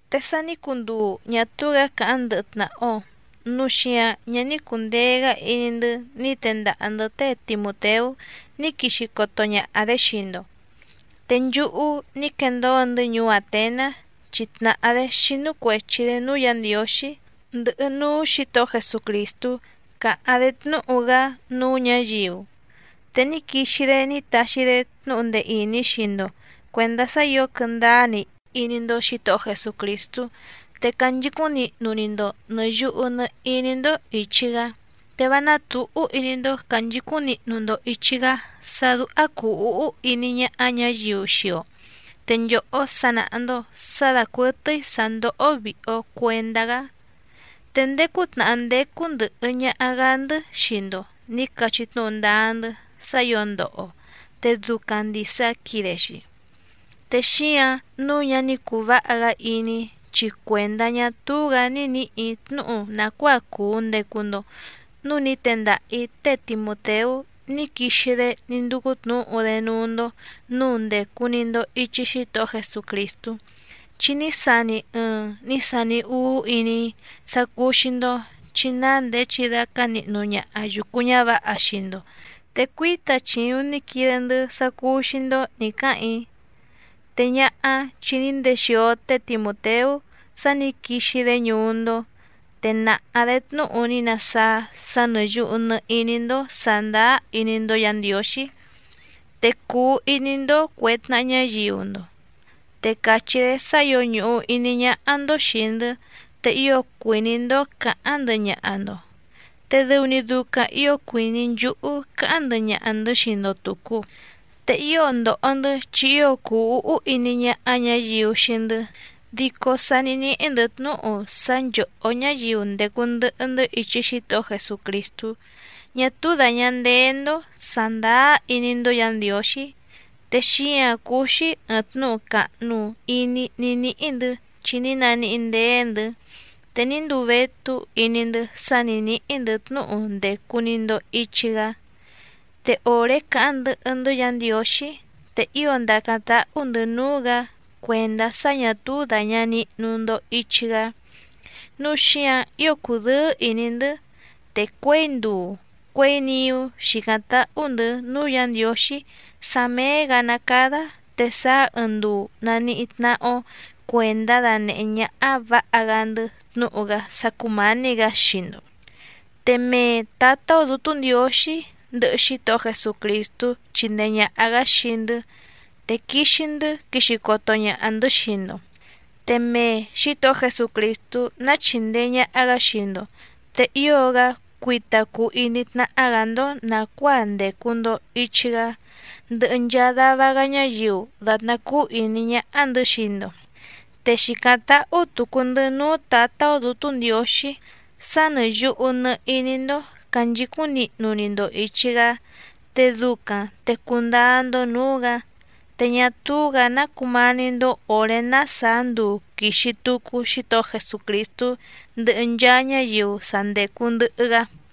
Te sa ní cunduu ñá túú‑gǎ càháⁿ ndɨhɨ tnàha‑o, núu xíǎⁿ ñá ní cùndee‑gá iní‑ndɨ́ ní tendaha‑ndɨ̌ té Timùteú ní quixi coto ñaha‑dě xii‑ndo, te nchúhú ní quendóo‑ndɨ́ ñuú Àtenás, chi tnàhá‑dé xínú cuèchi‑dé núú Yǎ Ndiǒxí, ndɨhɨ núú Xǐtohó Jesucrìstú càháⁿ‑dé tnúhu‑gá núú ñǎyiu. Te ní quixi‑dé ní taxi‑dé tnúhu ndee ìní xii‑ndo cuèndá sá ǐo quɨndáá‑ni iní‑ndó Xǐtohó Jesucrìstú, te canchicúⁿ nihnu‑ni‑ndo nɨ̀ yuhu nɨ iní‑ndó ìchi‑gá. Te vá nátǔhú iní‑ndó cànchicúⁿ nihnu‑ndo ìchi‑gá sá dúhá cùu úhú iní ñáhá ñǎyiu xii‑o, te nchòhó sa nàha‑ndo sá dàcuɨtɨ́í sǎ ndóhó vìhi‑o cuendá‑gá. Te ndéé cútnàhá ndécú ndɨ̀hɨ ñaha‑gá‑ndɨ́ xii‑ndo nǐ cachí tnúhu ndáá‑ndɨ́ sá ǐo ndoho‑o, te ducaⁿ ndìsa quide‑xi. Te xíǎⁿ nǔu ñá ní cùu váha‑gá iní‑í chi cuèndá ñá túú‑gǎ ní nǐhì‑í tnúhu nàcuáa cùu ndecu‑ndo núu ní tendaha‑ǐ té Timùteú ní quixi‑dé ní ndúcú tnǔhu‑dé núú‑ndó nǔu ndècu‑ni‑ndo ichi Xítohó Jesucrìstú, chi ní sani ɨɨⁿ ní sani úú iní‑í sá cúú‑xí‑ndó, chi ná ndèé chidácá nihnu ñaha yùcu ñávǎha xii‑ndo te cuíta chìuⁿ ní quide‑ndɨ́ sá cúú‑xí‑ndó nǐ cáhàⁿ‑í. Te ñáhá, chi ní ndexìo té Timùteú sá nǐ quixi‑dé ñuú‑ndó, te nàha‑dé tnúhu ní nasáá sá nɨ̀ yuhu nɨ iní‑ni‑ndo sàndáá iní‑ndó Yǎ Ndiǒxí, te cùu iní‑ndó cuè tnaha ñáyiu‑ndo. Te càchí‑dé sá ǐo ñùhu iní ñáhá‑ndó xìi‑ndɨ́, te ío cuìní‑ndó cǎháⁿ ndɨhɨ ñaha‑ndo, te dɨu‑ni ducaⁿ ǐo cuìní nchúhú cáháⁿ ndɨhɨ ñaha‑ndɨ̌ xii‑ndo tùcu. Te ío ndòho‑ndɨ́ chi ío cùu úhú iní ñáhá ñǎyiu xii‑ndɨ́, dico sá nǐ níhí‑ndɨ̌ tnúhu sá nchòhó ñáyiu ndècu ndɨhɨ‑ndɨ́ ichi Xítohó Jesucrìstú ñá túú dàña ndéé‑ndó sàndáá iní‑ndó Yǎ Ndiǒxí, te xíǎⁿ cúú‑xí ɨ̀ɨⁿ tnúhu càhnu iní ní níhí‑ndɨ̌ chi ní naníhí ndéé‑ndɨ̌. Te ní nduu vétú iní‑ndɨ́ sá nǐ níhí‑ndɨ̌ tnúhu ndècu‑ni‑ndo ichi‑gá. Te òré càháⁿ ndɨhɨ‑ndɨ́ Yǎ Ndiǒxí, te ío ndàcáⁿ táhú‑ndɨ̌ núú‑gǎ cuèndá sá ñà túú dàña nihnu‑ndo ichi‑gá, núu xíǎⁿ ío cùdɨ́ɨ́ ìní‑ndɨ́. Te cuěi nduu cuěi niú xìcáⁿ táhú‑ndɨ̌ núú Yǎ Ndiǒxí sá méé‑gǎ ná càda te sáá ɨɨⁿ nduu nàníhí tnáhá‑ó cuèndá danèhé ñáhá vǎha‑gá‑ndɨ́ tnúhu‑gá sá cúmǎní‑gǎ xii‑ndo. Te mee Tǎtá‑ó Dǔtú Ndiǒxí, ndɨhɨ Xítohó Jesucrìstú chindee ñàha‑gá xii‑ndɨ́ te quixi‑ndɨ́ quixi coto ñaha‑ndɨ̌ xii‑ndo. Te mee Xǐtohó Jesucrìstú ná chìndee ñaha‑gá xii‑ndo, te ío‑gá cuita cuu iní tnáhá‑gǎ‑ndó nàcuáa ndècu‑ndo ichi‑gá ndɨhɨ nchaa dava‑gá ñáyiu dàtná cúú ìní ñáhá‑ndɨ̌ xii‑ndo. Te xìcáⁿ táhú tùcu‑ndɨ́ núú Tǎtá‑ó Dǔtú Ndiǒxí sá nɨ̀ yuhu nɨ iní‑ndó cànchicúⁿ nihnu‑ni‑ndo ìchi‑gá, te ducaⁿ te cundáá‑ndó nǔú‑gǎ, te ñá túú‑gǎ ná cumání‑ndó òré ná sàá nduu quìxi tucu Xítohó Jesucrìstú ndɨhɨ nchaa ñáyiu sa ndècu ndɨhɨ‑gá.